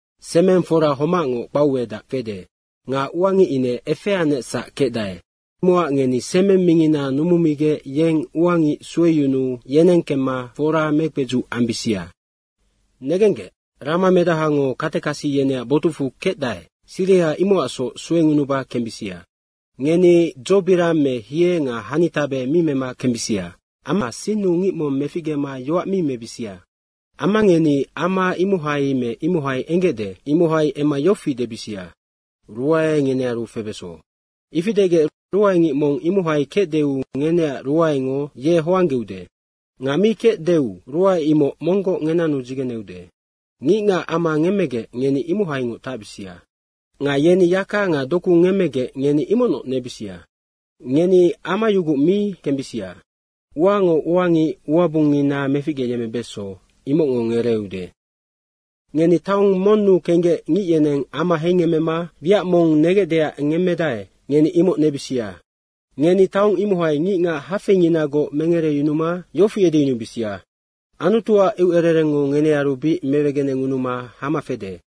“Semeng fora homacngoc kpauedac fede nga ua ngic ine efeanecsac kecdae. Imocac ngeni semeng mingina numumigec yeng ua ngic sueyunuu yeneng kemma foraya mekpedzuc ambisia. Negenggec, ramamedahango katekasi yeneac botucfu kecdae, siriha imocacsoc suengunuba kembisia. Ngeni dzobirang me hie nga hanitabe mi mema kembisia. Amma sinnu ngic mong meficgema yoac mi mebisia. Amma ngeni ama imohai me imohai enggecde imohai emma yofi debisia, ‘Ruae ngenearu febeso.’ Ifi degec ruaengic mong imohai kecdeu ngeneac ruaengo ye hoanggeude nga mi kecdeu ruae imoc monggoc ngenanu dzigeneude. Ngicngac ama ngemmegec ngeni imohaingoc tacbisia. Nga yeni yaka nga doku ngemmegec ngeni imocnoc nebisia. Ngeni amayuguc mi kembisia. Uango ua ngic uabungngina meficgeyemmebeso, imocngo ngereeude. Ngeni taong monnu kenggec ngic yeneng ama heingemmema wiac mong negecdeac ngemmedae, ngeni imoc nebisia. Ngeni taong imohai ngicngac hafeinginagoc mengereyunuma yofi edeyunubisia, ‘Anutuac eucererengngo ngenearu bic mewegenengunuma hama fede.’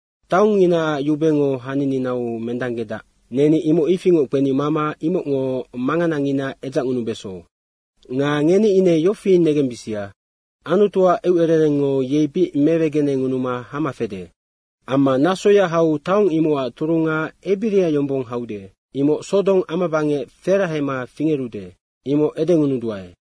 ‘Taongnginaac yubengo hanininau mendanggedac, neni imoc ifingoc kpeni mama imocngo manganangina edzacngunubeso. Nga ngeni ine yofi negembisia. Anutuac eucererengngo yei bic mewegenengunuma hama fede.’ Amma nasoya hau taong imocac turunga ebiria yombong haude, imoc Sodong amabangec ferahema fingerude, imoc edengunuduae.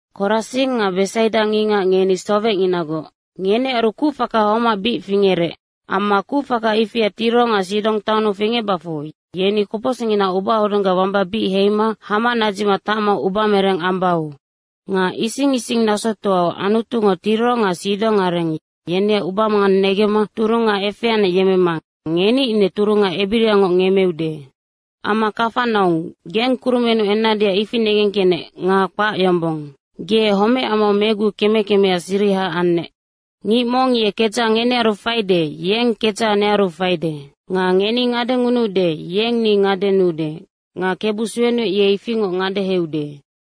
Korasing nga Besaida ngicngac, ngeni sowecnginagoc. Ngenearu kucfaka homac bic fingerec. Amma kucfaka ifia Tiro nga Sidong taonnu fingecbacfu yeni kopocsicnginaac ubahodunggac wamba bic heima hama nadzicma tacma ubamereng ambau. Nga ising ising nasotoau Anutungo Tiro nga Sidong areng, yeneac ubamangang negemma turunga efeanec yemmema ngeni ine turunga ebiriangoc ngemmeude. Amma Kafanaung, geng kurumennu ennadeac ifi negengkecnec nga kpac yombong. Ge homecamau megu keme kemea siriha annec. Ngic mong ye kedzaha ngenearu faide, yeng kedzaha nearu faide. Nga ngeni ngadengunuude, yeng ni ngadenuude nga Kebu suenuec, ye ifingoc ngadeheude.”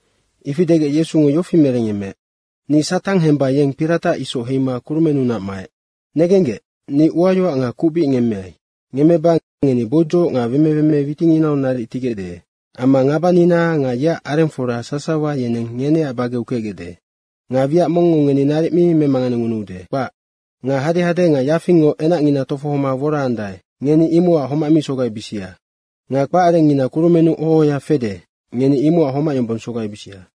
Ifi degec Yesungo yofi merengyemmeec, “Ni Satang hemba yeng piratac isoc heima kurumennunac maec. Negenggec, ni uayoac nga kuc bic ngemmeai. Ngemmeba ngeni boudzoc nga wemeweme witinginau naric tigecde amma ngabanina nga yeac arengfora sasawa yeneng ngeneac bageu kecgecde. Nga wiac mongngo ngeni naric mi memanganengunuude, kpac. Nga hadehade nga yafingngo enacngina tofohoma woraandae, ngeni imocac homac mi sogaibisia. Nga kpacarengngina kurumennu oho ohoya fede, ngeni imocac homac yombong sogaibisia.”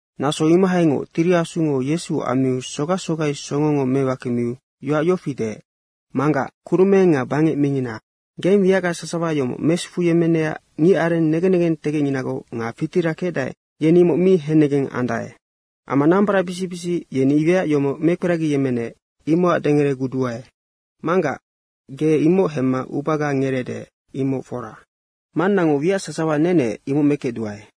Naso imohaingoc Tiri Asungo Yesu ammiu sogac sogai songongo mewakemiu yoac yofi deec, “Manggac, kurumeng nga bangec mingina, geng wiacga sasawa yomoc mesufuyemmenecac ngicareng negen negentegecnginagoc nga fitira kecdae, yeni imoc mi hennegeng andae. Amma nambaracbisic bisic, yeni wiac yomoc mekperagiyemmenec, imocac dengereguduae. Manggac, ge imoc hemma ubaga ngereede, imoc fora. Mannango wiac sasawa nenec imoc mekecduae.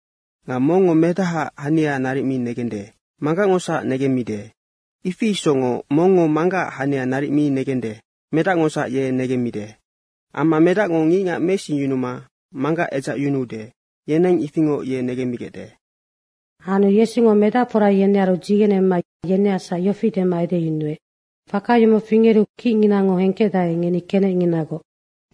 Nga mongngo Medahaac hania naric mi negende, Manggacngosac negemmide. Ifi isocngoc mongngo Manggacac hania naric mi negende, Medacngosac ye negemmide. Amma Medacngo ngicngac meisingyunuma Manggac edzacyunude, yeneng ifingoc ye negemmigecde.” Anu Yesungo medacfora yenearu dzigenema yeneacsac yofi dema edeyunuec, “Faka yomoc fingeru kicnginango hengkecdae, ngeni kenecnginagoc.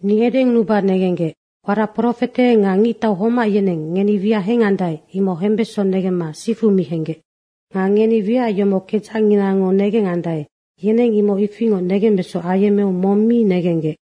Ni edengunuba negenggec, warac profete nga ngictau homac yeneng ngeni wiac hengandae, imoc hembeso negemma sifu mi henggec. Nga ngeni wiac yomoc kedzacnginango negengandae, yeneng imoc ifingoc negembeso ayemmeu mong mi negenggec.”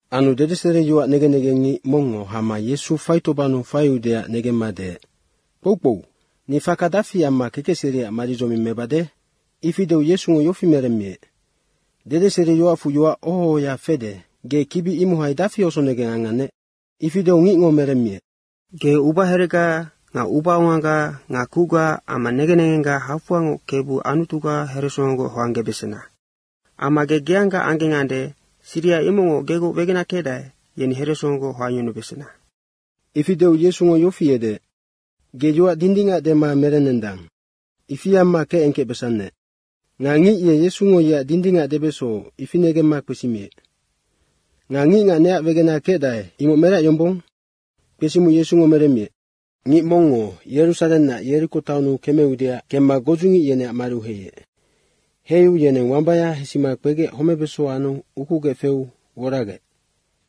Anu dedeseriyoac negen negengngic mongngo hama Yesu faitobannu faiudeac negemma deec, “Kpoukpou, ni faka dafi amma kekecseriac maridzoming mebade?” Ifi deu Yesungo yofi meremmiec, “Dedeseriyoacfu yoac oho ohoya fede, ge kibi imohai dafi osonegeng angannec?” Ifi deu ngicngo meremmiec, “Ge ubaherega nga ubaongaga nga kucga amma negen negengga hafoangoc Kebu Anutuga heresongogoc hoanggebesena.” Amma, “Ge geangga anggengande, siriha imocngoc gegoc wegena kecdae, yeni heresongogoc hoangyunubesena.” Ifi deu Yesungo yofi edeec, “Ge yoac dindingac dema merennendang. Ifi amma kecengkecbesannec.” Nga ngic ye Yesungo yeac ngic dindingac debeso, ifi negemma kpesimiec, “Nga ngicngac neac wegena kecdae, imoc merac yombong?” Kpesimiu Yesungo meremmiec, “Ngic mongngo Yerusarennac Yeriko taonnu kemeudeac kemma godzungic yeneac mariu heiec. Heiu yeneng wambaya hesima kpegec homebeso anu ukugec feu woragec.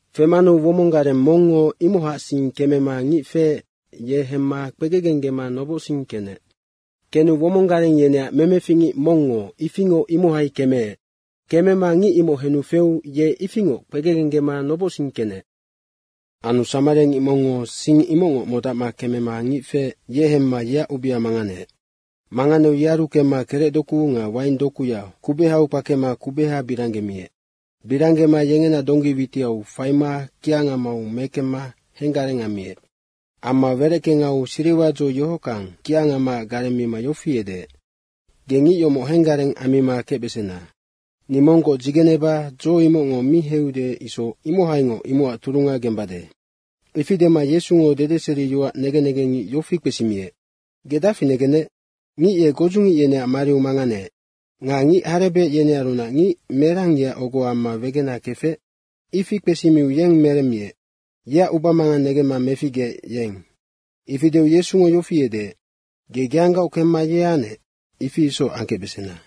Femanu womong gareng mongngo imohacsing kemema ngic feec, ye hemma kpegegenggema nobocsing kenec. Kenu womong gareng yeneac memefic ngic mongngo ifingoc imohai kemeec. Kemema ngic imoc henu feu ye ifingoc kpegegenggema nobocsing kenec. Anu samariangic mongngo sing imocngoc modacma kemema ngic feec, ye hemma yeac ubea manganeec. Manganeu yearu kemma kerec doku nga waing dokuya kubehau kpakema kubeha biranggemiec. Biranggema yengena donggi witiau faima kiangamau mekemma henggareng ammiec. Amma wereckengau siriwa dzo yohockang kiangamaac gareng mima yofi edeec, ‘Ge ngic yomoc henggareng ammima kecbesena. Ni monggoc dzigeneba dzo imocngo mi heiude isoc, imohaingoc imocac turunga gembade.’” Ifi dema Yesungo dedeseriyoac negen negengngic yofi kpesimiec, “Ge dafi negennec? Ngic ye godzungic yeneac mariu manganeec. Nga ngic harebec yenearunac ngic merang yeac ogo amma wegena kefec?” Ifi kpesimiu yeng meremmiec, “Yeac ubamangang negemma meficgeec, yeng.” Ifi deu Yesungo yofi edeec, “Ge geanggaoc kemma ye anec, ifi isoc angkecbesena.”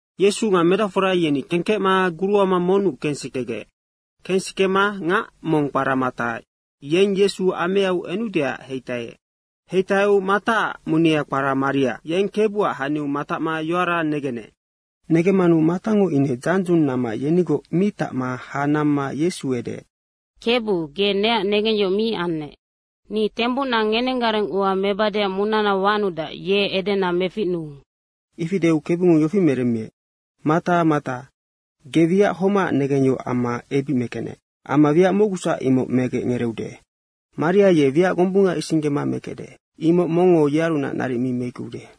Yesu nga medacfora yeni kengkecma guruama monnu kensikegec. Kensikema ngac mong kpara Mata, yeng Yesu ameau enudeac heitaiec. Heitaiu Mataac munea kpara Maria, yeng Kebuac haniu matacma yoara negenec. Negemmanu Matango ine dzandzung namma yenigoc mi tacma ha namma Yesu edeec, “Kebu, ge neac negengyohoc mi annec. Ni tembucna ngenenggareng ua mebadeac munana wanudac, ye edena meficnuu.” Ifi deu Kebungo yofi meremmiec, “Mata Mata, ge wiac homacac negengyohoc amma ebic mekecnec. Amma wiac mocgusac imoc megec ngereeude. Maria ye wiac gombunga isinggema mekecde, imoc mongngo yearunac naric mi meickeude.”